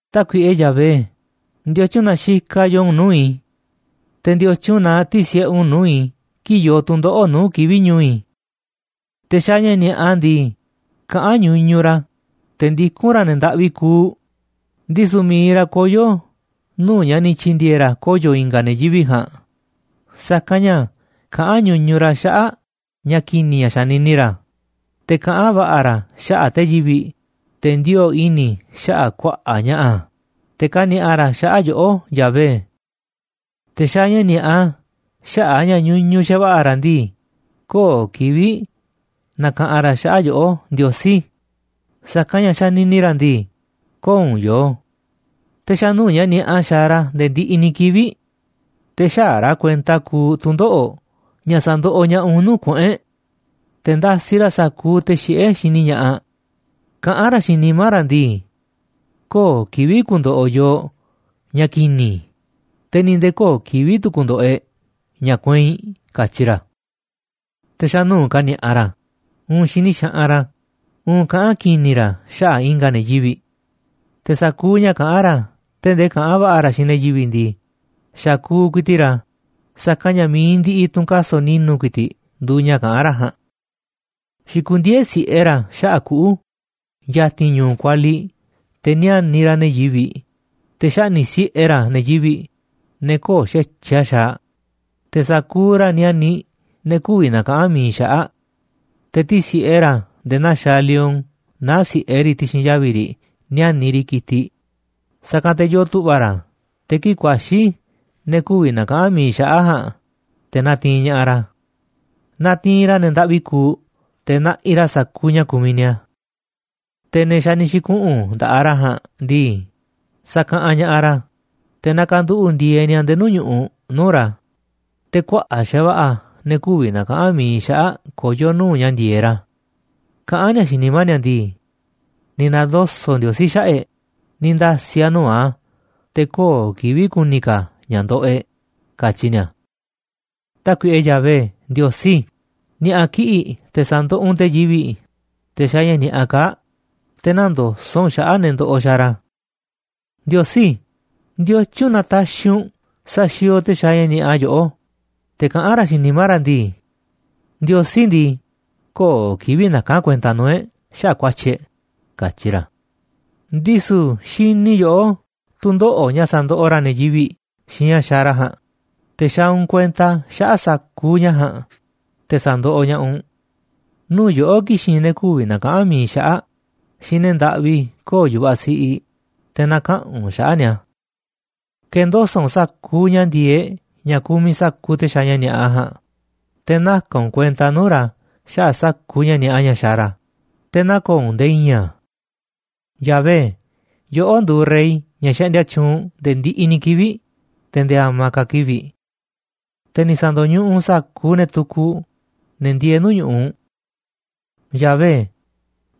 Tákuiꞌe Yahvé, ¿ndiotyun na xikaꞌ yoo u̱nꞌ nuu̱ꞌ i̱? Te̱, ¿ndiotyun na tisi̱ꞌe u̱nꞌ nuu̱ꞌ i̱ kii̱ꞌ yoo tu̱ndoꞌo̱ꞌ nuu̱ꞌ kivi̱ꞌ ñu̱u̱ i̱? Te̱ xaaꞌ ña̱ ni̱a̱ꞌa ndii, kaꞌán ñuñuꞌ ra̱, te̱ ndikún ra̱ ne̱ ndaꞌvi kuuꞌ, ndisu̱ mi̱iꞌ ra̱ koyo̱ nuu̱ꞌ ña̱ ni̱ tyi̱ndi̱e̱e̱ ra̱ koyo̱ i̱nga̱ ne̱ yivi̱ꞌ ja̱a̱nꞌ. Sa̱kanꞌ ña̱ kaꞌán ñuñuꞌ ra̱ xaꞌa̱ꞌ ña̱ ki̱ni̱ ña̱ xanini ra̱, te̱ kaꞌán va̱ꞌa̱ ra̱ xaꞌa̱ꞌ te̱ yivi̱ꞌ, te̱ ndioo̱ꞌ i̱ni̱ xaꞌa̱ꞌ kuaꞌa̱ꞌ ña̱ꞌa̱, te̱ kani̱a̱ꞌa ra̱ xaꞌa̱ꞌ yoꞌó, Yahvé. Te̱ xaaꞌ ña̱ ni̱a̱ꞌa xaꞌa̱ꞌ a̱ ña̱ ñuñuꞌ xa̱va̱ꞌa̱ ra̱ ndii, köo̱ꞌ kivi̱ꞌ nakaꞌanꞌ ra̱ xaꞌa̱ꞌ yoꞌó, Ndiosí, sa̱kanꞌ ña̱ xanini ra̱ ndii, köo̱ꞌ u̱nꞌ yoo. Te̱ xa̱ nuu̱ꞌ ña̱ ni̱a̱ꞌa xaaꞌ ra̱ nde̱e̱ ndiꞌiꞌ ni̱ kivi̱ꞌ. Te̱ xäaꞌ ra̱ kuenta kuuꞌ tu̱ndoꞌo̱ꞌ ña̱ sa̱ndoꞌoꞌ ña̱ꞌaꞌ u̱nꞌ nuu̱ꞌ kuꞌu̱n e̱ꞌ. Te̱ ndasiꞌ ra̱ sa̱kuuꞌ te̱ xiꞌé xini ña̱ꞌaꞌ. Kaꞌán ra̱ xiinꞌ nimá ra̱ ndii: “Köo̱ꞌ kivi̱ꞌ ku̱ndo̱ꞌo̱ yooꞌ ña̱ ki̱ni̱, te̱ ni̱ nde̱e̱ köo̱ꞌ kivi̱ꞌ tu̱ ku̱ndo̱ꞌo̱ e̱ꞌ ña̱ kueinꞌ”, katyi ra̱. Te̱ xa̱ nuu̱ꞌ kani̱a̱ꞌa ra̱, uun xini xaꞌanꞌ ra̱, uun kaꞌán ki̱ni̱ ra̱ xaꞌa̱ꞌ i̱nga̱ ne̱ yivi̱ꞌ. Te̱ sa̱kuuꞌ ña̱ kaꞌán ra̱, tee̱ꞌ ndee kaꞌán va̱ꞌa̱ ra̱ xiinꞌ ne̱ yivi̱ꞌ ndii, xakuuꞌ ku̱i̱ti̱ꞌ ra̱, sa̱kanꞌ ña̱ mi̱iꞌ ndiꞌiꞌ tu̱ꞌu̱n kaso̱ꞌ ni̱nu̱ ku̱i̱ti̱ꞌ nduuꞌ ña̱ kaꞌán ra̱ ja̱a̱nꞌ. Xikundieé si̱ꞌe ra̱ xaꞌa̱ꞌ kuꞌu̱ ya̱ti̱n ñu̱u̱ kualiꞌ te̱ níániꞌ ra̱ ne̱ yivi̱ꞌ, te̱ xaꞌni̱ꞌ si̱ꞌe ra̱ ne̱ yivi̱ꞌ, ne̱ köo̱ꞌ xa̱tyiꞌ a̱ xaaꞌ, te̱ sa̱kuuꞌ ra̱ níániꞌ ne̱ kü̱vi̱ na̱kaꞌa̱n mi̱iꞌ xaꞌa̱ꞌ. Te̱ tisi̱ꞌe ra̱ nde̱e̱ naa xaaꞌ lion naá si̱ꞌe riꞌ ti̱xi̱n yavi̱ riꞌ níániꞌ riꞌ ki̱tiꞌ, sa̱kanꞌ te̱ yoo tu̱ꞌva̱ ra̱ te̱ kii̱ꞌ ku̱a̱xi̱ ne̱ kü̱vi̱ na̱kaꞌa̱n mi̱iꞌ xaꞌa̱ꞌ ja̱a̱nꞌ, te̱ na̱ti̱i̱n ña̱ꞌaꞌ ra̱. Natiinꞌ ra̱ ne̱ ndaꞌvi kuuꞌ te̱ naꞌiꞌ ra̱ sa̱kuuꞌ ña̱ kumiꞌ ni̱a̱. Te̱ ne̱ xa̱ ni̱ xi̱kuꞌu̱n nda̱ꞌaꞌ ra̱ ja̱a̱nꞌ ndii, sakaꞌanꞌ ña̱ꞌaꞌ ra̱, te̱ nakanduꞌu̱ꞌ ndieeꞌ ni̱a̱ nde̱e̱ nuu̱ꞌ ñu̱ꞌuꞌ nuu̱ꞌ ra̱, te̱ kuaꞌa̱ꞌ xa̱va̱ꞌa̱ ne̱ kü̱vi̱ na̱kaꞌa̱n mi̱iꞌ xaꞌa̱ꞌ koyó nuu̱ꞌ ña̱ ndi̱e̱eꞌ ra̱. Kaꞌán ni̱a̱ xiinꞌ nimá ni̱a̱ ndii: “Ni̱ na̱ndoso̱ꞌ Ndiosí xaꞌa̱ꞌ e̱ꞌ, ni̱ nda̱si̱ a̱ nuu̱ꞌ a̱, te̱ köo̱ꞌ kivi̱ꞌ ku̱ni̱ ka̱ a̱ ña̱ ndoꞌoꞌ e̱ꞌ”, katyi ni̱a̱. Tákuiꞌe Yahvé Ndiosí, ni̱a̱ꞌa̱ kiꞌi̱ꞌ te̱ sa̱ndoꞌoꞌ u̱nꞌ te̱ yivi̱ꞌ, te̱ xaaꞌ ña̱ ni̱a̱ꞌa kaa̱ꞌ, te̱ nä̱ndoso̱ꞌ u̱nꞌ xaꞌa̱ꞌ ne̱ ndoꞌoꞌ xaaꞌ ra̱. Ndiosí, ¿ndiotyun na taxiꞌ u̱nꞌ saxiooꞌ te̱ xaaꞌ ña̱ ni̱a̱ꞌa yoꞌó? Te̱ kaꞌán ra̱ xiinꞌ nimá ra̱ ndii: “Ndiosí ndii, köo̱ꞌ kivi̱ꞌ naka̱n a̱ kuenta nuu̱ꞌ e̱ꞌ xaꞌa̱ꞌ ku̱a̱tyi̱ e̱ꞌ”, katyi ra̱. Ndisu̱ xini yoꞌó tu̱ndoꞌo̱ꞌ ña̱ sandoꞌoꞌ ra̱ ne̱ yivi̱ꞌ xiinꞌ ña̱ xaaꞌ ra̱ ja̱a̱nꞌ, te̱ xaaꞌ u̱nꞌ kuenta xaꞌa̱ꞌ sa̱kuuꞌ ña̱ ja̱a̱nꞌ, te̱ sa̱ndoꞌoꞌ ña̱ꞌaꞌ u̱nꞌ. Nuu̱ꞌ yoꞌó ki̱xi̱n ne̱ kü̱vi̱ na̱kaꞌa̱n mi̱iꞌ xaꞌa̱ꞌ xiinꞌ ne̱ ndaꞌvi köo̱ꞌ yu̱vaꞌ siꞌiꞌ, te̱ na̱kaꞌa̱n u̱nꞌ xaꞌa̱ꞌ ni̱a̱. Ke̱ndoso̱ꞌ u̱nꞌ sa̱kuuꞌ ña̱ ndi̱e̱eꞌ ña̱ kumiꞌ sa̱kuuꞌ te̱ xaaꞌ ña̱ ni̱a̱ꞌa ja̱a̱nꞌ, te̱ naka̱n u̱nꞌ kuenta nuu̱ꞌ ra̱ xaꞌa̱ꞌ sa̱kuuꞌ ña̱ ni̱a̱ꞌa ña̱ xaaꞌ ra̱, te̱ nä̱ko̱o̱ u̱nꞌ nde̱e̱ i̱i̱n a̱. Yahvé, yoꞌó nduuꞌ rey, ña̱ xaꞌndia tyuunꞌ nde̱e̱ ndiꞌiꞌ ni̱ kivi̱ꞌ, te̱ nde̱e̱ a̱ma̱ ka̱ kivi̱ꞌ. Te̱ ni̱ sa̱ndo̱ñuꞌuꞌ u̱nꞌ sa̱kuuꞌ ne̱ tukuꞌ, ne̱ ndieeꞌ nuu̱ꞌ ñu̱ꞌuꞌ u̱nꞌ. Yahvé,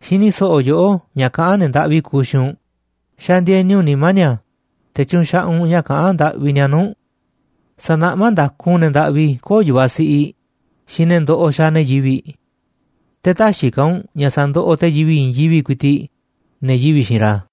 xini so̱ꞌo̱ yoꞌó ña̱ kaꞌán ne̱ ndaꞌvi kuuꞌ xiinꞌ u̱nꞌ, xandieni u̱nꞌ nimá ni̱a̱, te̱ tyunxaꞌaꞌ u̱nꞌ ña̱ kaꞌán ndaꞌvi ni̱a̱ nuu̱ꞌ u̱nꞌ. Sa̱naꞌmá nda̱ku u̱nꞌ ne̱ ndaꞌvi köo̱ꞌ yu̱vaꞌ siꞌiꞌ xiinꞌ ne̱ ndoꞌoꞌ xaaꞌ ne̱ yivi̱ꞌ. Te̱ täxiꞌ ka̱ u̱nꞌ ña̱ sa̱ndoꞌoꞌ te̱ yivi̱ꞌ i̱i̱n yivi̱ꞌ ku̱i̱ti̱ꞌ, ne̱ yivi̱ꞌ xiinꞌ ra̱.